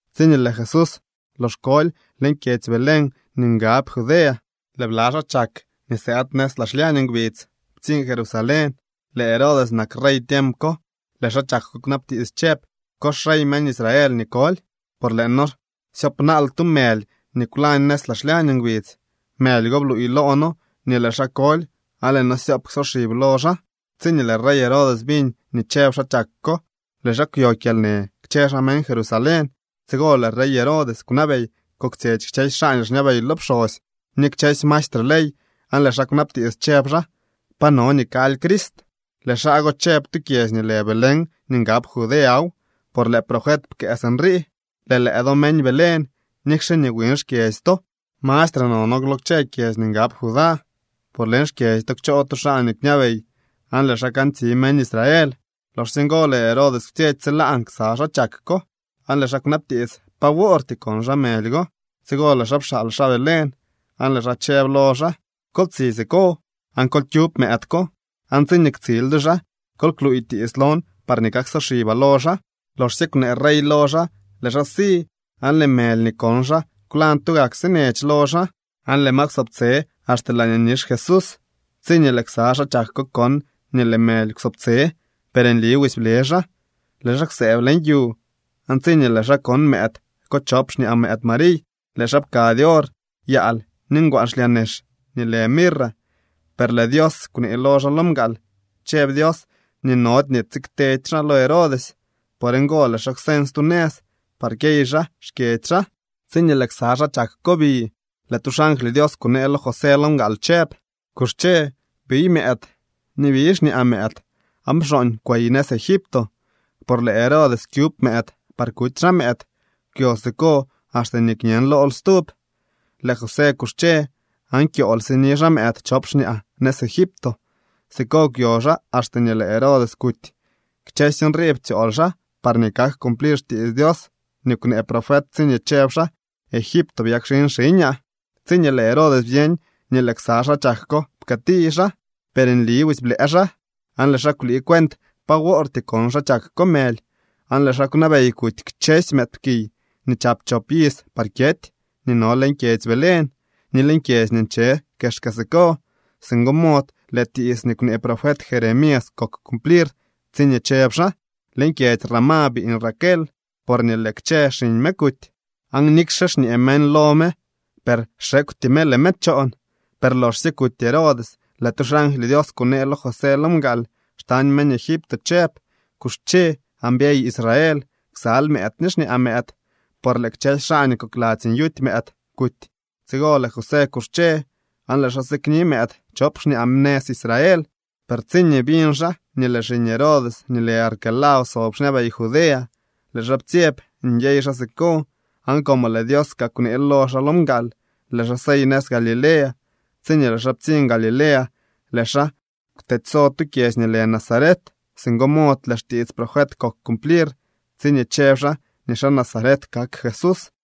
Tsiñee lëë Jesús lox koly leñ kyedzy Belén nii ngab Judea, lëë bla xaa chak nii sëëd nëz laa xlyañ ngbidz ptsiñ Jerusalén. Lëë Herodes nak rey tiemp ko. Lëë xaa chak ko kwnabtiits chëb: —¿Ko xrey meñ Israel nii koly? Por lëë noo syoopnaal tu mëly nii kwlañ nëz laa xlyañ ngbidz. Mëly go bluuy loo noo nii lëë xaa koly aan lëë noo syoop ksoxib lo xaa. Tsiñee lëë rey Herodes biñ nii chëb xaa chak ko, lëë xaa kwyo kyalnë kchë xaa meñ Jerusalén. Tsigo lëë rey Herodes kwnabey koktsyetsy kchësy xaa nii xñabey lo pxosy ni kchësy maestre ley, aan lëë xaa kwnabtiits chëb xaa: —Pa no nii kaly Crist. Lëë xaa go chëb: —Tu kyedzy nii lë Belén nii ngab Judeaw, por lëë profet pkëë sinrii: Lëë lëë do meñ Belén, nikxe nii wiñ xkyedzy to, mastre nono lo kchë kyedzy nii ngab Judá, por leñ xkyedzy to kchoo tu xaa nii kñabey, aan lëë xaa kantsi meñ Israel. Loxsye ngo lëë Herodes kwtsyetsy tsilaan ksa xaa chak ko, aan lëë xaa kwnabtiits pa woortyee kon xaa mëly go. Tsigo lëë xaa pxaal xaa Belén, aan lëë xaa chëb lo xaa: —Kol tsi siko, aan kol kyub mëëd ko. Aan tsiñee ktsil do xaa, kol kluuy tiits lon parñee kaksoxibaa lo xaa. Loxsye kwnee rey lo xaa, lëë xaa si. Aan lëë mëly nii kon xaa kwlañ tugak sinech lo xaa, aan lëë ma kwsobtse axte laañee nix Jesús. Tsiñee lëë ksa xaa chak ko kon nii lëë mëly kwsobtse, per nli busy ble xaa. Lëë xaa kwsëëb leñ yu, aan tsiñee lëë xaa kon mëëd chop xñaa mëëd Mariy, lëë xaa pkady or, yaal ni ngwaan xlyaa nex nii lë mirra. Per lëë Dios kwnee lo xaa lo mgaal. Chëb Dios nii nody nii tsiktedy xaa lo Herodes. Por ngo lëë xaa kwseñ stu nëz par kyey xaa xkyedzy xaa. Tsiñee lëë ksa xaa chak ko bi, lëë tu xangly Dios kunee lo José lo mgaal chëb: —Kuxche, biy mëëd ni biy xñaa mëëd aan pxooñ kwey nëz Egipto. Por lëë Herodes kyub mëëd par kuty xaa mëëd. Kwyo siko axte nii kñen lool stub. Lëë José kuxche aan kyool sini xaa mëëd chop xñaa nëz Egipto. Siko kwyo xaa axte nii lëë Herodes kuty. Kchësy nrii ptsyool xaa parñee kak cumplir xtiits Dios nii kwnee profet tsiñee chëb xaa: “Egipto byakxin xiñaa.” Tsiñee lëë Herodes byeñ nii lëë ksa xaa chak ko pkëëti xaa, per nli busy blëë xaa. Aan lëë xaa kwlii cuent pa wortyee kon xaa chak ko mëly, aan lëë xaa kwnabey kuty kchësy mëëdpkiy nii chap chop iz par kyety nii no leñ kyedzy Belén ni leñ kyedzy nii nche kexka siko. Singo mod lëë tiits nii kwnee profet Jeremías kok cumplir tsiñee chëb xaa: Leñ kyedzy Ramá biiñ Raquel, porñee lëë kchë xiñ me kuty, aan nikxe xñee meñ lo me, per xekwty me, lëë me choon. Per loxsye kuty Herodes, lëë tu xangly Dios kunee lo José lo mgaal xtañ meñ Egipto chëb: —Kuxche, aan byey Israel ksal mëëd ni xñaa mëëd, por lëë kchësy xaa nii kokladzy nyuty mëëd kuty. Tsigo lëë José kuxche aan lëë xaa sikni mëëd chop xñaa nëz Israel. Per tsiñee biñ xaa nii lëë xiñ Herodes nii lë Arquelao sob xñabey Judea, lëë xaa ptsyeb nyey xaa siko. Aan como lëë Dios kaa kwneel lo xaa lo mgaal, lëë xaa sey nëz Galilea. Tsiñee lëë xaa ptsiñ Galilea, lëë xaa kwtedyso tu kyedzy nii lë Nazaret. Singo mod lëë xtiits profet kok cumplir tsiñee chëb xaa nii xaa Nazaret kak Jesús.